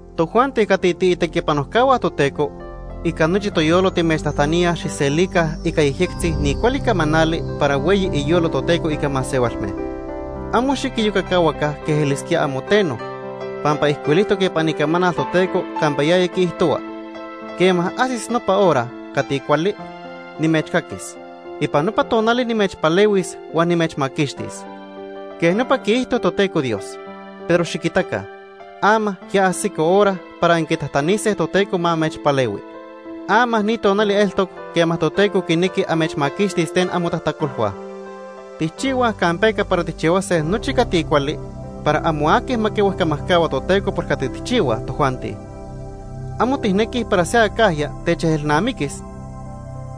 Tojuanti cati tiitequipanojcahua Toteco, ica nochi toyolo timechtajtaníaj xijselica ica yejyectzi ni cuali camanali para hueyi iyolo Toteco ica masehualme. Amo xiquiyocacahuaca quej elisquíaj amo teno, pampa ijcuilijtoc ipan Icamanal Toteco campa yaya quiijtohua: “Quema ajsis nopa hora cati cuali, nimechcaquis. Ipan nopa tonali nimechpalehuis huan nimechmaquixtis.” Quej nopa quiijto Toteco Dios. Pero xiquitaca, ama ya ajsico hora para anquitajtanise Toteco ma amechpalehui. Ama ni tonali eltoc quema Toteco quinequi amechmaquixtis ten amotajtacolhua. Tijchihuaj campeca para tijchihuase nochi cati cuali para amo aqui ma quihuejcamajcahua Toteco por cati tijchihuaj tojuanti. Amo tijnequij para se acajya techejelnamiquis,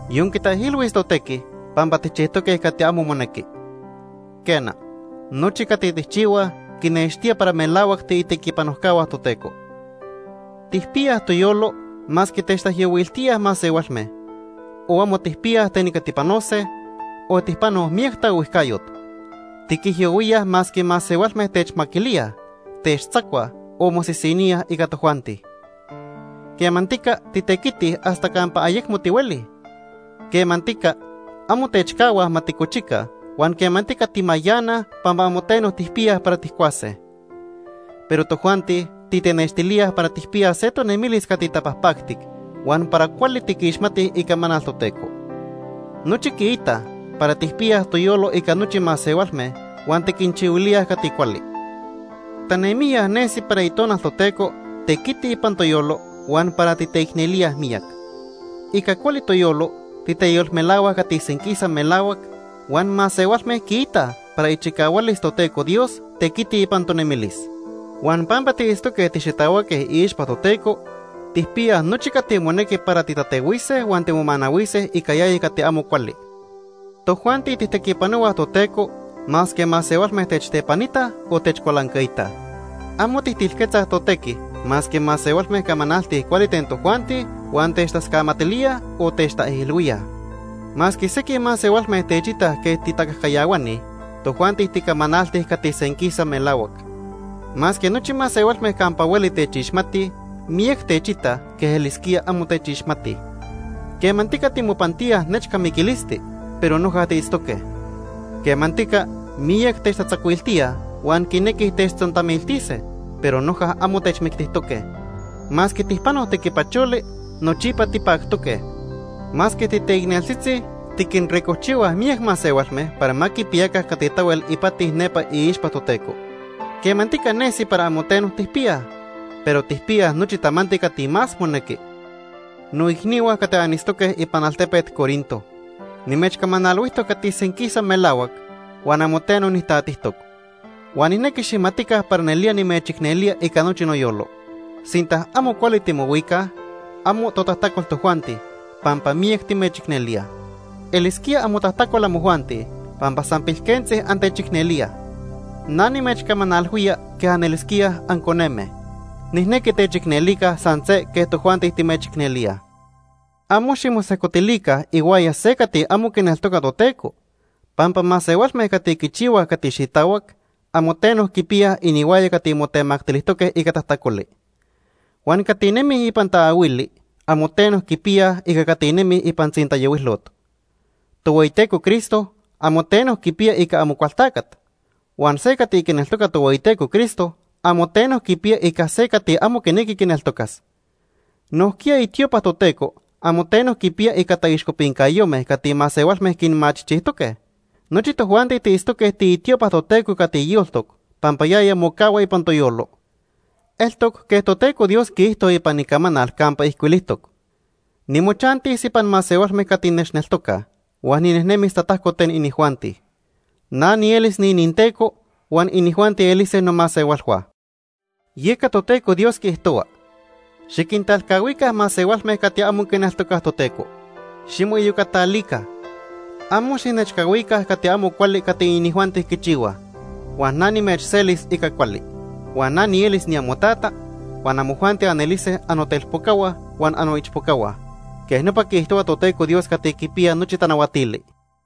yon quitaijilhuis totequi pampa tijchijtoque cati amo monequi. Quena, nochi cati tijchihuaj, quinextía para melahuac tiitequipanojcahua Toteco. Tijpiyaj toyolo masque techtaijyohuiltíaj masehualme, o amo tijpiyaj ten ica tipanose, o tijpanoj miyac taohuijcayot. Tiquijyohuíaj masque masehualme techmaquilíaj, techtzacuaj, o mosisiníaj ica tojuanti. Quemantica titequitij hasta campa ayecmo tihuelij. Quemantica amo techcahuaj ma ticochica huan quemantica timayanaj pampa amo teno tijpiyaj para tijcuase. Pero tojuanti titenextilíaj para tijpiyaj se tonemilis cati tapajpactic huan para cuali tiquixmatij Icamanal Toteco. Nochi quiitaj para tijpiyaj toyolo ica nochi masehualme huan tiquinchihuilíaj cati cuali. Tanemijya nesi para Itonal Toteco tequiti ipan toyolo huan para titeicnelíaj miyac. Ica cuali toyolo titeyolmelahuaj cati senquisa melahuac, huan masehualme quiitaj para ichicahualis Toteco Dios tequiti ipan tonemilis. Huan pampa tiitztoque tixitahuaque iixpa Toteco, tijpiyaj nochi cati monequi para titatehuise huan timomanahuise ica yaya cati amo cuali. Tojuanti tijtequipanohuaj Toteco masque masehualme techtepanitaj, o techcualancaitaj. Amo tijtilquetzaj totequi masque masehualme camanaltij cuali ten tojuanti huan techtascamatilíaj, o techtaijilhuíaj. Masque sequij masehualme techitaj quej titacajcayahuani, tojuanti ticamanaltij cati senquisa melahuac. Masque nochi masehualme campa hueli techixmatij, miyac techitaj quej elisquía amo techixmatij. Quemantica timopantíaj nechca miquilisti, pero noja tiitztoque. Quemantica miyac techtatzacuiltíaj huan quinequij techtzontamiltise, pero noja amo techmictijtoque. Masque tijpanoj tequipacholi, nochipa tipactoque. Masque titeicneltzitzi, tiquinricojchihuaj miyac masehualme para ma quipiyaca cati tahuel ipati nepa iixpa Toteco. Quemantica nesi para amo teno tijpiyaj, pero tijpiyaj nochi tamanti cati más monequi. Noicnihua cati anitztoque ipan altepet Corinto, nimechcamanalhuijtoc cati senquisa melahuac, huan amo teno nijtatijtoc. Huan nijnequi xijmatica para nelía nimechicnelía ica nochi noyolo. Sinta amo cuali timohuicaj, amo totajtacol tojuanti, pampa miyac timechicnelíaj. Elisquía amotajtacol amojuanti pampa san pilquentzi antechicnelíaj. Na nimechcamanalhuía quej anelisquíaj anconeme. Nijnequi techicnelica san se quej tojuanti timechicnelíaj. Amo ximosejcotilica ihuaya se cati amo quineltoca Toteco, pampa masehualme cati quichihuaj cati xitahuac, amo teno quipiyaj inihuaya cati motemactilijtoque ica tajtacoli. Huan cati nemij ipan taahuili amo teno quipiyaj ica cati nemij ipan tzintayohuilot. Tohueyiteco Cristo amo teno quipiya ica Amocualtacat. Huan se cati quineltoca Tohueyiteco Cristo amo teno quipiya ica se cati amo quinequi quineltocas. Nojquiya itiopa Toteco amo teno quipiya ica taixcopincayome cati masehualme quinmachijchijtoque. Nochi tojuanti tiitztoque tiitiopa Toteco cati yoltoc pampa yaya mocahua ipan toyolo. Eltoc quej Toteco Dios quiijto ipan Icamanal campa ijcuilijtoc: “Nimochantis ipan masehualme cati nechneltocaj, huan ninejnemis tatajco ten inijuanti. Na nielis niininTeco, huan inijuanti elise nomasehualhua.” Yeca Toteco Dios quiijtohua: “Xiquintalcahuica masehualme cati amo quineltocaj Toteco. Ximoiyocatalica. Amo xijnechcahuica cati amo cuali cati inijuanti quichihuaj. Huan na nimechselis ica cuali. Huan na nielis niamoTata, huan amojuanti anelise annotelpocahua huan annoichpocahua. Quej nopa quiijtohua Toteco Dios Cati Quipiya Nochi Tanahuatili.”